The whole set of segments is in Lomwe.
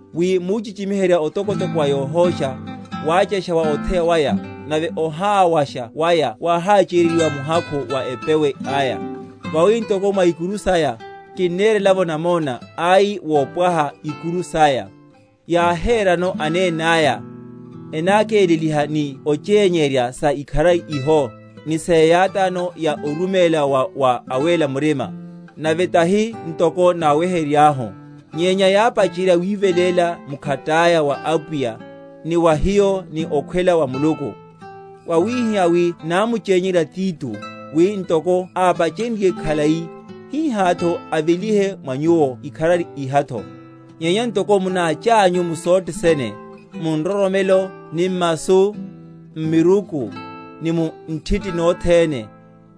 wi muchichi?-?miherya otokotoko wa yohósha, wáchasha wa otheya waya, nave oháwasha waya wáhácheryeryiwa muhakhu wa epewe aya. Vawi ntoko mwa ikuru saya, kinnerela’vo namona, ai wopwaha ikuru saya, yáherano anenaya, enákeleliha ni onchényerya sa ikharari iho, ni seyátáno ya oruméla wa wa awéla murima; nave, tahi ntoko náweheryeryahu; nyenya yápacherya wiveléla mkhataya wa Apwiya, ni wa hiyo ni okhwela wa Muluku. Wawihihá wi námuchényerya Tito, wi ntoko ápachenryiye khalai, hihátho avelihe mwa nyuwo ikharari ihatho. Nyenya ntoko munáchanyu mu sothe sene, mu nroromelo, ni m’masu, m’miruku, ni mu nthiti nothene,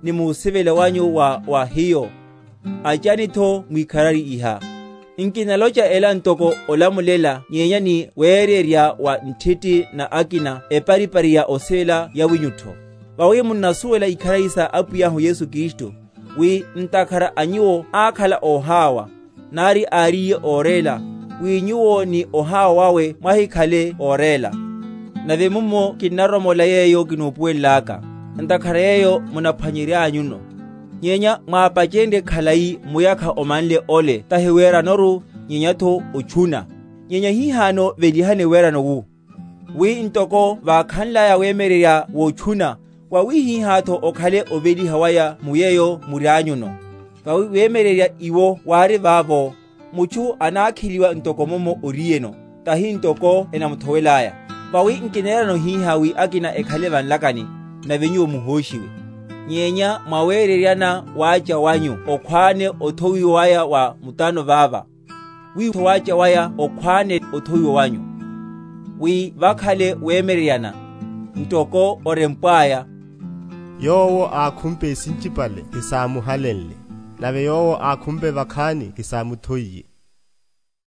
ni musivela wanyu wa wa hiyo, achanitho mwikharari iha. Nkinalocha ela ntoko olamulela nyenya ni wererya wa nthiti na akina eparipari ya osivela yawinyutho. Vawi munnasuwela ikharari sa Apwiyahu Yesu Kristu, wi, ntakhara a nyuwo ákhala óháwa, nari áriye óréla, wi nyuwo ni oháwa wawe mwahikhale óréla. Nave mummo kinnaromola yeyo kinupuwelelaka; ntakhara yeyo munaphwanyeryanyuno, nyenya mwapachenrye khalai muyakha omanle ole tahi weranoru, nyenyatho otchuna. Nyenya hihano velihani werano wu; wi ntoko vákhanlaya wemyeryerya wotchuna, wawihihátho okhale oveliha waya mu yeyo murianyuno. Vawi wemyeryerya iwo wári vavo, mutchu anákheliwa ntoko mummo oriyeno, tahi ntoko enamuthowelaya. Vawi nkinerano hihá wi akina ekhale va nlakani, nave nyuwo muhóshiwe; nyenya mwa wereryana wácha wanyu okhwáne othowiwa waya wa mutano vava, witho wácha waya okhwáne othowiwa wanyu. Wi vakhale wereryana; ntoko orempwaya, Yowo ákhumpe sinchipale hesámuhalenle; nave yowo ákhumpe vakhani hesámuthoiye.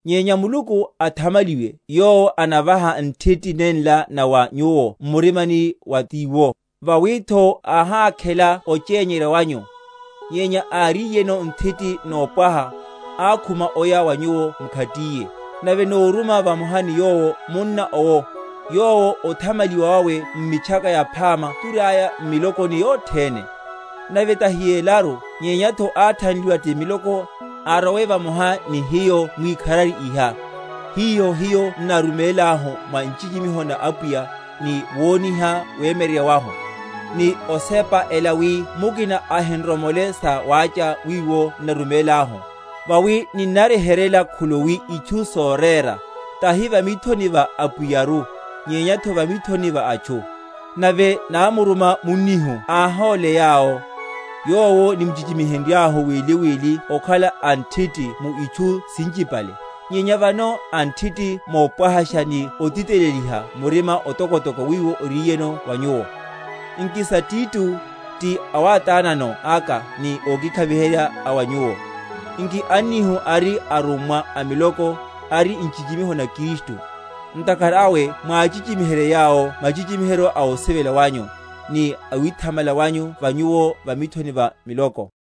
Nyenya Muluku athamaliwe, yowo anavaha nthiti nenla na wa nyuwo m’murimani wa Tiwo. Vawitho áhákhela ochényerya wanyu; nyenya áríyeno nthiti nopwaha, ákhuma oya wa nyuwo mkhatiyene. Nave nóruma vamoha ni yowo munna owo, yowo othamaliwa wawe m’Mitchaka Yaphama turiaya m’milokoni yothene; nave tahi yelaru, nyenyatho athanliwa ti miloko, arowe vamoha ni hiyo mwikharari iha, hiho hiyo n’narumélahu, mwa nchichimiho na Apwiya, ni woniha wemyeryerya wahu; ni osepa ela wi mukina ahinr mole sa wácha wiwo n’narumélahu; vawi ninnaryeheryela khuluwi itchu sorera, tahi va mithoni va Apwiyaru, nyenyatho va mithoni va atchu. Nave námuruma munnihu áhóle yawo, yowo nimchichi?-?mihenryahu wili wili okhala a nthiti mu itchu sinchipale, nyenya vano a nthiti nopwahasha ni otiteleliha murima otokotoko wiwo oriyeno wa nyuwo. Nki sa Tito, ti awátánano aka ni ókikhaviheryáka a wa nyuwo; nki annihu, ari arummwa a miloko, ari nchichimiho na Kristu. Ntakhara awe mwachichimiherye yawo machichimiheryo a osivela wanyu, ni awithamala wanyu va nyuwo va mithoni va miloko.